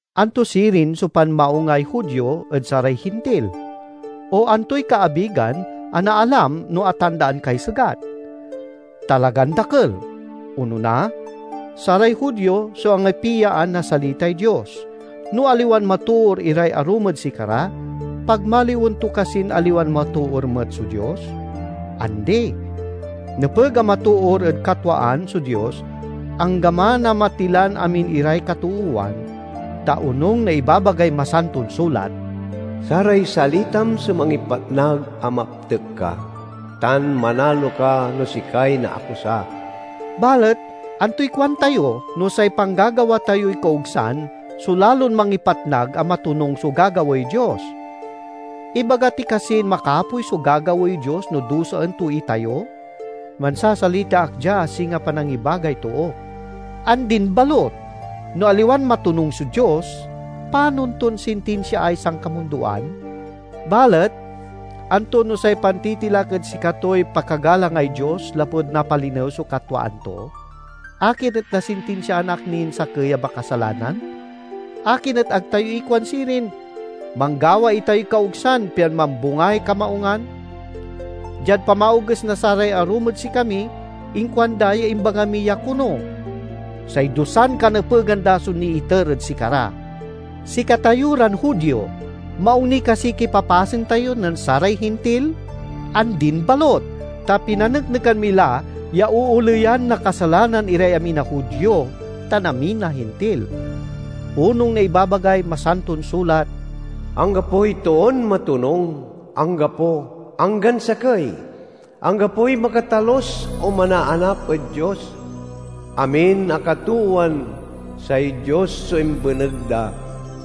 Anto sirin so panmaungay Judio ed saray Hintil? O antoy kaabigan a naalam no atandaan kay segat? Talagan dakel! Onona, saray Judio so angipiaan na salitay Dios. No aliwan matoor iray arum ed sikara, pagmaliwen to kasin aliwan matoor met so Dios? Andi! Nepeg a matoor ed katwaan so Dios anggaman a matilan amin iray katoowan, ta onung na ibabagay Masanton Sulat, "Saray salitam so mangipatnag a maptek ka; tan manalo ka no sikay naakusa." Balet antoy kuan tayo, no say panggagawa tayoy kaogsan so lalon mangipatnag a matonung so gagawaey Dios? Ibaga ti kasin makapoy so gagawaey Dios no dusaen to itayo? (Mansasalita ak dia a singa panangibagay too.) Andin balut! No aliwan matonung so Dios, panon ton sintinsiaay sankamundoan? Balet, anto no say pantitilak et sikatoy pakagalangay Dios lapud napalinew so katwaan to? Akin et nasintinsiaan ak nin sakey a makasalanan? Akin et ag tayo ikuan sirin, "Manggawa itayoy kaogsan, pian mambungay kamaungan"? Diad pamaoges na saray arum ed sikami, inkuanda ya imbaga mi ya kono! Say dusan kanepegan da so niiter ed sikara. Sikatayo ran Judio, maung ni kasiy kipapasen tayo nen saray Hintil? Andin balut! Ta pinaneknekan mi la ya ooleyan na kasalanan iray amin a Judio tan amin a Hintil. Onung na ibabagay Masanton Sulat: "Anggapoy toon matonung, anggapo, anggan sakey; anggapoy makatalus o manaanap ed Dios. Amin a katoowan say Dios so imbeneg da;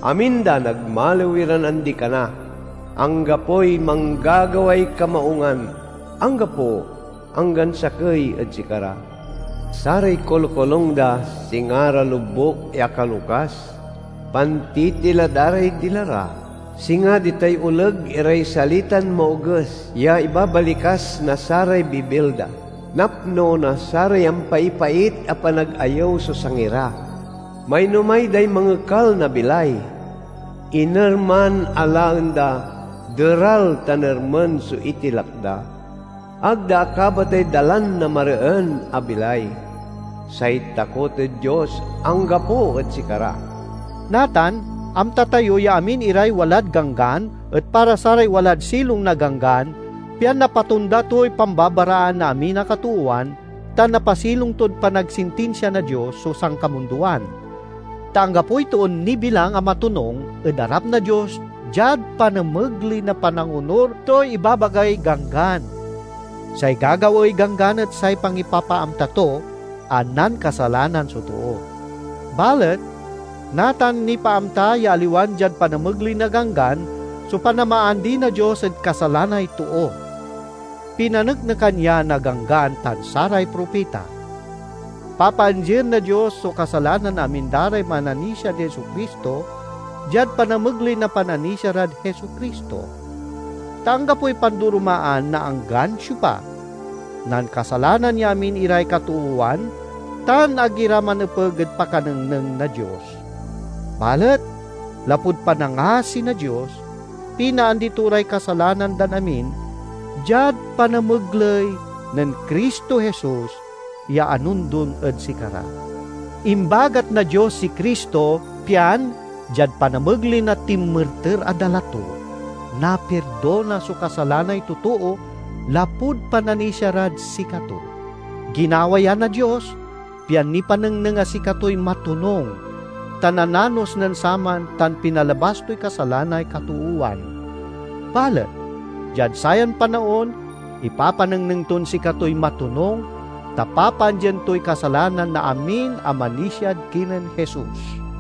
amin da nagmaliw iran andi-kana; anggapoy manggagaway kamaungan, anggapo, anggan sakey ed sikara. Saray kolokolung da singa ra lobuk ya akalokas; pantitila da ray dila ra, singa ditay oleg iray salitan maoges ya ibabalikas na saray bibil da; napno na saray ampaipait a panagayew so sangi ra. Mainomay day mangekal na bilay; inerman a laen da deral tan ermen so itilak da. Ag da akabatay dalan na mareen a bilay; say takot ed Dios anggapo ed sikara." Natan amta tayo ya amin iray walad Ganggan et para saray walad silong na Ganggan, pian napatonda toy pambabaraan na amin a katoowan tan napasilong tod panagsintinsia na Dios so sankamundoan. Ta anggapoy toon nibilang a matonung ed arap na Dios diad panamegley na panangonur toy ibabagay Ganggan. Say gagawaey Ganggan et say pangipapaamta to a nankasalanan so too. Balet natan nipaamta ya aliwan diad panamegley na ganggan so panamaandi na Dios ed kasalanay too. Pinaneknekan ya na Ganggan tan saray propita. Papaandien na Dios so kasalanan na amin da ray mananisiad Jesu-Cristo, diad panamegley na pananisia rad Jesu-Cristo. Ta anggapoy pandoromaan na anggan siopa: nankasalanan ya amin iray katoowan tan ag ira manepeg ed pakanengneng na Dios. Balet lapud panangasi na Dios, pinaandi to ray kasalanan dan amin diad panamegley nen Cristo Jesus ya anondon ed sikara. Imbagat na Dios si Cristo pian, diad panamegley na tinmerter a dala to, napirdona so kasalanay totoo lapud pananisia rad sikato. Ginawa ya na Dios, pian nipanengneng a sikatoy matonung, ta nananos nen saman tan pinalabas toy kasalanay katoowan. Balet, diad sayan panaon, ipapanengneng ton sikatoy matonung, ta papaandien toy kasalanan na amin a manisiad kinen Jesus.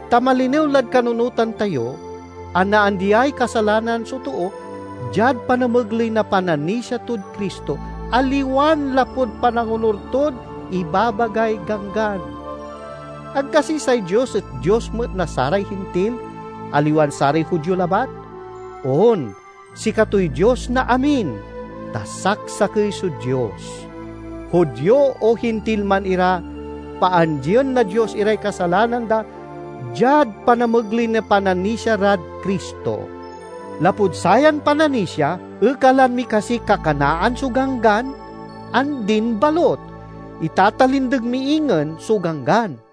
Ta malinew lad kanunotan tayo a naandiay kasalanan so too diad panamegley na pananisia tod Cristo, aliwan lapud panangonur tod ibabagay Ganggan. Ag kasi say Dios et Dios met na saray Hintil, aliwan saray Judio labat? On, sikatoy Dios na amin, ta saksakey so Dios. Judio o Hintil man ira, paandien na Dios iray kasalanan da diad panamegley na pananisia rad Cristo. Lapud sayan pananisia, ekalan mi kasiy kakanaan so Ganggan? Andin balut! Itatalindeg mi ingen so Ganggan.